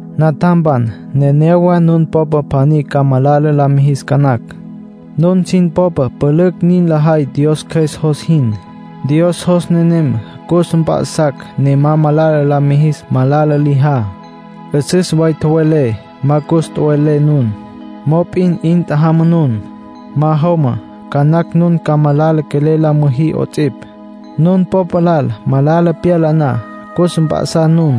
Natjampan, nenéyawa nun popa pjaní ca malala la mijis ca nacj. Nun sin popa pülücj nin lajay Dios Cjües jos jin. Dios jos nenem cus mp'a'sacj ne ma malala la mijis malala lijá. 'Üsüs way tjowelé, ma cus tjowe'lé nun. Mop'in 'in tjajama nun. Ma jomá, ca nacj nun ca malala quelel la müjí 'ots'ipj. Nun popa lal malala pyala na, cus mp'a'sá nun.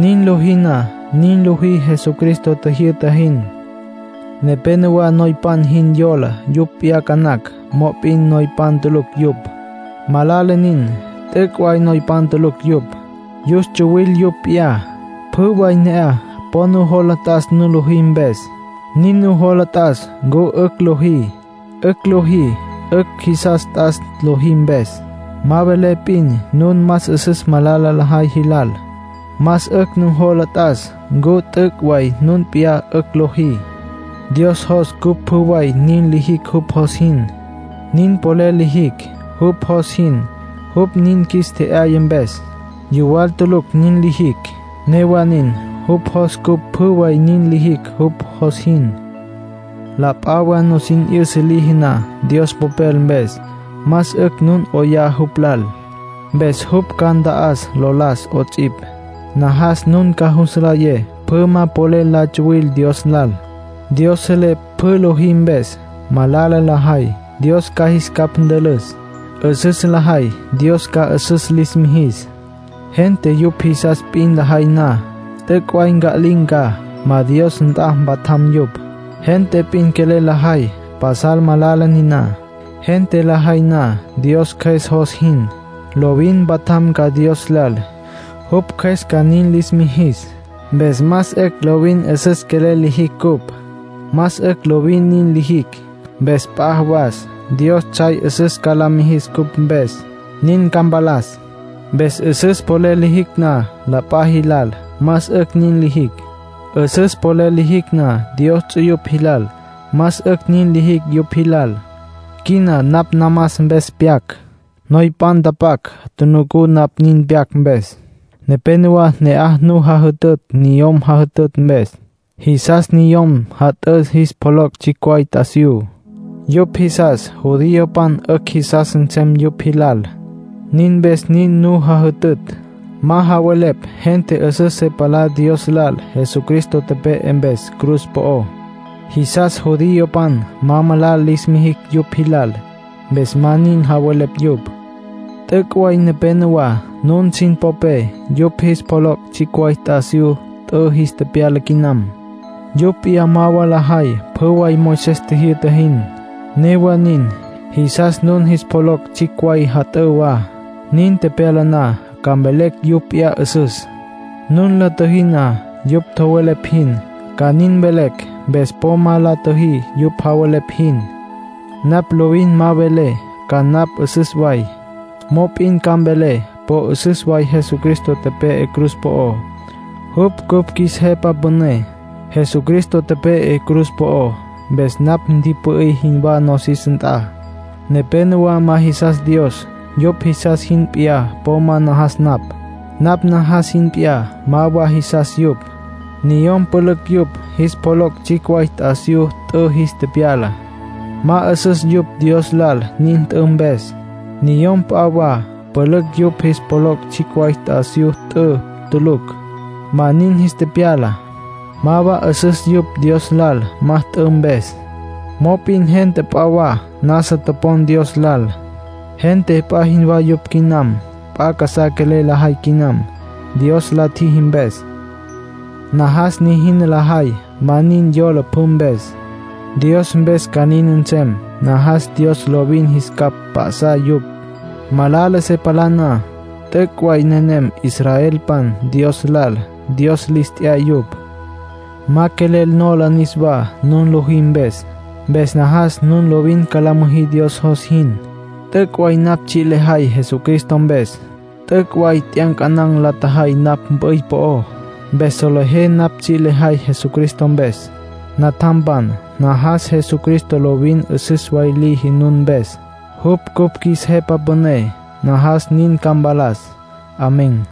Nin lojí na, nin lojí Jesucristo tjijyü'ta jin. Nepénowa noypan jin yola yupj p'iyá ca nacj, mop'in noypan tulucj yupj. Malala nin. T'üc' way noypan tulucj yupj. Yus tsuwil yupj p'iyá. Pjü way ne'aj, po nujola t'as nun lojí mpes. Nin nujola t'as ncu 'ücj lojí. 'Ücj lojí, 'ücj jisas t'as lojí mpes. Ma mvelé p'in nun más 'üsüs malala lajay jilal. Más 'ücj nujola t'as ncu t'üc' way nun p'iyá 'ücj lojí. Dios jos cupj pjü way nin lijicj jupj jos jin. Nin polel lijicj jupj jos jin, jupj nin qjuis tje'yaya mpes. Yuwal tulucj nin lijicj. Newa nin, jupj jos cupj pjü way nin lijicj jupj jos jin. La p'a wa nusin 'yüsa liji na Dios Popel mpes, más 'ücj nun 'oyá jupj lal. Mpes jupj ca nta'as lo las 'ots'ipj. Najas nun ca jus nlayé pjü ma polel la tsuwil Dios lal. Dios selé pjü lojí mpes. Malala lajay, Dios ca jis capj ntülüs. 'Üsüs lajay, Dios ca 'üsüs lis mijis. Gente yupj jisas p'in lajay na, t'üc' way nca'lin̈ ca, ma Dios nt'a mpatjam yupj. Gente p'in quelel lajay, pasal malala niná. Gente lajay na Dios Cjües jos jin, lovin mpatjam ca Dios lal, jupj Cjües ca nin lis mijis. Mpes más 'ücj lovin 'üsüs quelel lijicj cupj. Más 'ücj lovin nin lijicj. Mpes p'a jawas Dios tsjay 'üsüs ca la mijis cupj mpes, nin ca mpalas. Mpes 'üsüs polel lijicj na la p'a jilal, más 'ücj nin lijicj. 'Üsüs polel lijicj na Dios ts'uyupj jilal, más 'ücj nin lijicj yupj jilal. Quina napj namas mpes pyac. Letra noypan tjunucú napj nin pyac mpes. Nepénowa ne'aj nu jajütütj niyom jat'ǘ mpes, jisas niyom jat'ǘ jis pjoloc' tsjicj way t'asiyú. Yupj jisas judiopan 'ücj jisas nsem yupj jilal. Nin mpes nin nu jajütütj. Ma javelepj gente 'üsüs se palá Dios lal Jesucristo tepe'e mpes cruz po'ó. Jisas judiopan ma malala lis mijicj yupj jilal, mpes ma nin javelepj yupj. T'üc' way nepénowa nun sin popé yupj jis pjoloc' tsjicj way t'asiyú t'ü jis tepyala quinam. Yupj p'iyá ma wa lajay pjü way Moisés tjijyü'ta jin. Newa nin, jisas nun jis pjoloc' tsjicj way jat'ǘ wa. Nin tepyala na, ca mvelecj yupj p'iyá 'üsüs. Nun la tjüjí na yupj tjowelepj jin, ca nin mvelecj. Mpes po ma la tjüjí yupj javelepj jin. Napj lovin ma mvelé ca napj 'üsüs way. Mop'in ca mvelé po 'üsüs way Jesucristo tepe'e cruz po'ó, jupj cupj qjuis Jepa Püné. Jesucristo tepe'e cruz po'ó, mpes napj ntipü'í jinwá nosis nt'a. Nepénowa ma jisas Dios; yupj jisas jin p'iyá po ma najas napj. Napj najas jin p'iyá ma wa jisas yupj. Niyom pülücj yupj jis pjoloc' tsjicj way t'asiyú t'ü jis tepyala. Ma 'üsüs yupj Dios lal nin t'ü mpes. Niyom p'a wa pülücj yupj jis pjoloc' tsjicj way t'asiyú t'ü tulucj, ma nin jis tepyala. Ma wa 'üsüs yupj Dios lal ma t'ü mpes. Mop'in gente p'a wa nasa topon Dios lal. Gente p'a jinwá yupj quinam, p'a casá quelel lajay quinam, Dios la tjiji mpes. Najas nijina lajay ma nin yola pjü mpes; Dios mpes ca nin nsem. Najas Dios lovin jis capj p'ya'sa yupj, malala se palá na. T'üc' way nenem israelpan Dios lal. Dios lis t'ya yupj. Ma quelel nola niswá nun lojí mpes. Mpes najas nun lovin ca la müjí Dios jos jin. T'üc' way napj tsji' lejay Jesucristo mpes. T'üc' way t'yancanan̈ la tjajay napj mp'üy po'ó, mpes solejé napj tsji' lejay Jesucristo mpes. Natjampan, najas Jesucristo lovin 'üsüs way liji nun mpes. Jupj cupj qjuis Jepa Püné. Najas nin ca mpalas. Amén.